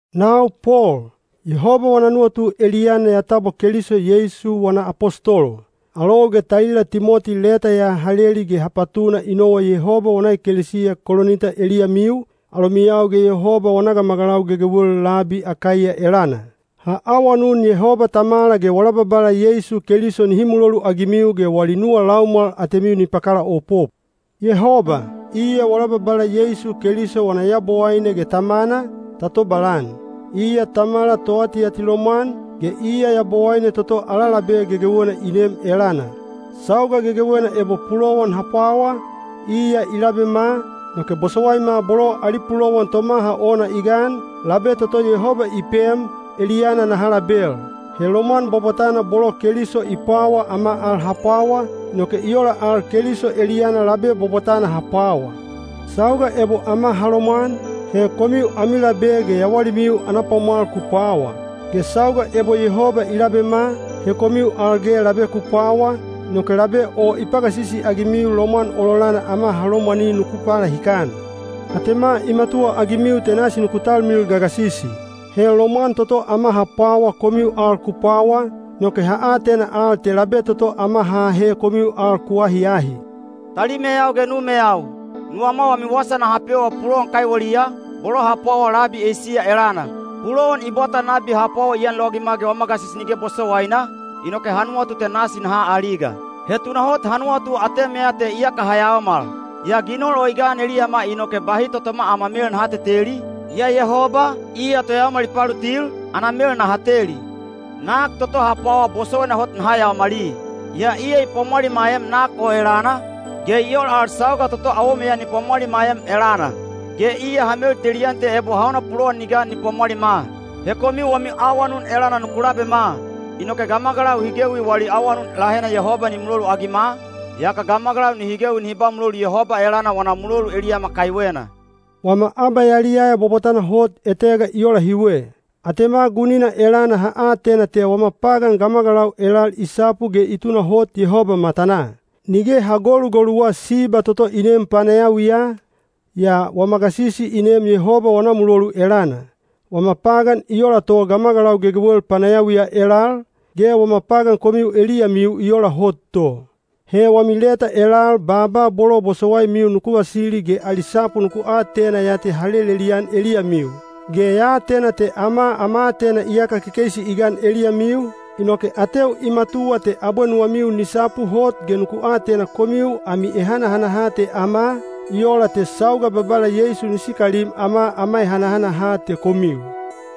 Nau Pol, Yehoba wana nuwatu eliyana ya tabwa Keliso Yeisu wana apostolo. Alou ge talila Timoti leta ya ha leli ge ha patuna i nowa Yehoba wana ekelesiya Kolinita eliyamiu, alomiyau ge Yehoba wana gamagalau gegewel labi Akaiya elana. Ha awanun Yehoba Tamala ge wala Babala Yeisu Keliso nihi muloluagimiu ge wali nuwa laumwal atemiu ni pakalaopop. Yehoba, iya wala Babala Yeisu Keliso wana Yabowaine ge Tamana, ta tobalan. Iya Tamala toatiatilomwan, ge iya Yabowaine toto ala labe gegewena i neem elana. Sauga gegewena ebo pulowan ha pwawa, iya i labema, inoke bosowaima bolo ali pulowan tomaha ona i gan, labe toto Yehoba i pem, eliyana naha label. He lomwan bwabwatana bolo Keliso i pwawa ama al ha pwawa, inoke i ola al Keliso eliyana labe bwabwatana ha pwawa. Sauga ebo ama ha lomwan, he komiu ami labe ge yawalimiu ana pwamwal ku pwawa. Ge sauga ebo Yehoba i labema, he komiu al ge labe ku pwawa, inoke labe o i pagasisi-agimiu lomwan ololana ama ha lomwani nuku palahikan. Atema i matuwaagimiu te nasi nuku talmilil gagasisi. He lomwan toto ama ha pwawa komiu al ku pwawa, inoke ha atena al te labe toto ama ha ahe komiu al ku ahiahi. Talimeyau ge numeyau, nuwama wami wasa naha pewa pulowan kaiweliya, bolo ha pwawa labi Eisiya elana. Pulowan i bwata nabi ha pwawa i anlowagima ge wama gasisi nige bosowaina, inoke ha nuwatu te nasi naha aliga. He tunahot ha nuwatu atemeya te iyaka ha yayaomal. Yaa ginol o i gan eliyama inoke bahi totoma ama mel naha teteli, yaa Yehoba, iya toyaomal i palutil, ana mel naha teli. Nak toto ha pwawa bosowaina hot naha yaomali, yaa iya i pwamwalimaem nak o elana, ge i ola al sauga toto awomeya ni pwamwalimaem elana. Ge iya ha meltelian te ebo hauna pulowan ni gan ni pwamwalima. He komiu wami awanun elana nuku labema. Inoke gamagalau hi gewi wali awanun lahena Yehoba ni muloluagima, yaka gamagalau nihi gewi nihi ba mulolu Yehoba elana wana mulolu eliyama kaiwena. Wama abayaliyaya bwabwatana hot etega i ola hiwe: atema gunina elana ha atena te wama pagan gamagalau elal i sapu ge i tunahot Yehoba matanaa. Nige ha golugoluwa siba toto i neem panayawiya, yaa wama gasisi i neem Yehoba wana mulolu elana. Wama pagan i ola to gamagalau gegewel panayawiya elal, ge wama pagan komiu eliyamiu i ola hot to. He wami leta elal baaba bolo bosowaimiu nuku vasili ge ali sapu nuku atena ya te ha lelelian eliyamiu. Ge ya atena te ama ama aatena iyaka kekeisi i gan eliyamiu, inoke ateu i matuwa te abwe nuwamiu ni sapu hot ge nuku atena komiu ami ehanahanaha te ama, i ola te sauga Babala Yeisu ni sikalim ama ama ehanahanaha te komiu.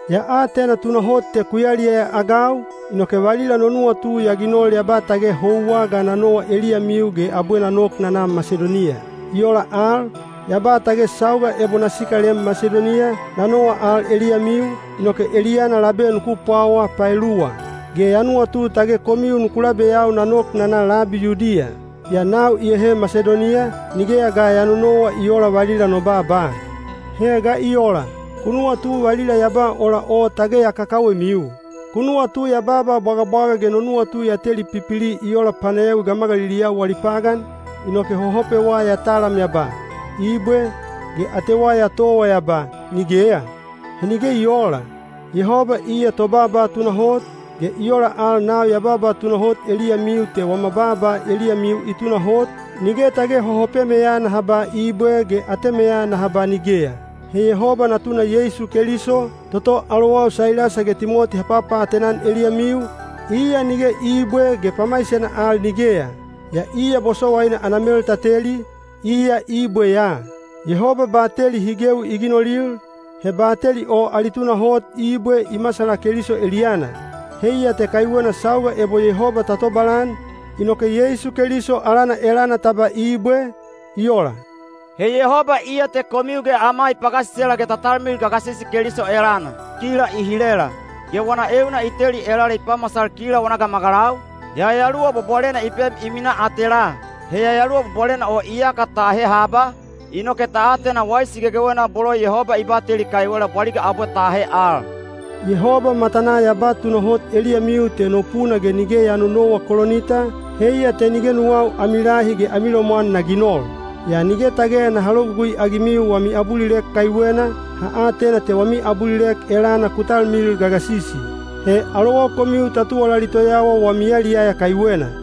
Ya atena tunahot te ku yaliyaya-agau, inoke valila no nuwatu ya ginol ya ba tage houwa ga na nowa eliyamiu ge abwe na nok na na Masidoniya. I ola al, ya ba tage sauga ebo na sikalem Masidoniya, na nowa al eliyamiu, inoke eliyana labe nuku pwawa paeluwa. Ge ya nuwatu tage komiu nuku labeyau na nok na na labi Yudiya. Yaa nau iyahe Masidoniya, nigeya ga ya nonowa i oola valila no baaba. He ga i ola? Ku nuwatu valila ya ba ola o tage ya kakawemiu? Ku nuwatu ya baaba bwagabwaga ge no nuwatu ya teli pipili i ola panayawi gamagaliliyau wali pagan, inoke hohopewa ya talam ya ba, “Ibwe,” ge atewa ya towa ya ba, “Nigeya”? He nige i oola! Yehoba iya tobaaba tunahot, ge i ola al nau ya ba tunahot eliyamiu te wama baaba eliyamiu i tunahot, nige tage hohopemeya naha ba “Ibwe” ge atemeya naha ba “Nigeya.” He Yehoba Natuna Yeisu Keliso, toto alowau Sailasa ge Timoti ha papaatena-an eliyamiu, iya nige “Ibwe” ge pamaisena al “Nigeya.” Yaa iya bosowaina ana mel ta teli, iya “Ibwe” ya. Yehoba bateli hi gewi i ginolil, he bateli o ali tunahot “Ibwe” i masala Keliso eliyana. Heiya te kaiwena sauga ebo Yehoba ta tobalan, inoke Yeisu Keliso alana elana ta ba “Ibwe. I ola.” He Yehoba iya te komiu ge ama i pagasisela ge ta talmilil gagasisi Keliso elana. Kila i hilela, ge wana euna i teli elala i pamasal kila wana gamagalau, Yayaluwa Bwabwalena i pem i minaa atelaa. He Yayaluwa Bwabwalena o iyaka ta ahe haba, inoke ta atena waisi gegewena bolo Yehoba i bateli kaiwela bwaliga abwe ta ahe al. Yehoba matanaa ya ba tunahot eliyamiu te no puna ge nige ya nonowa Kolinita, heiya te nige nuwau ami lahi ge ami lomwan na ginol. (Yaa nige tage naha logugui-agimiu wami abulilek kaiwena, ha atena te wami abulilek elana ku talmilil gagasisi. He alowau komiu ta tuwalali toyawa wami yaliyaya kaiwena.)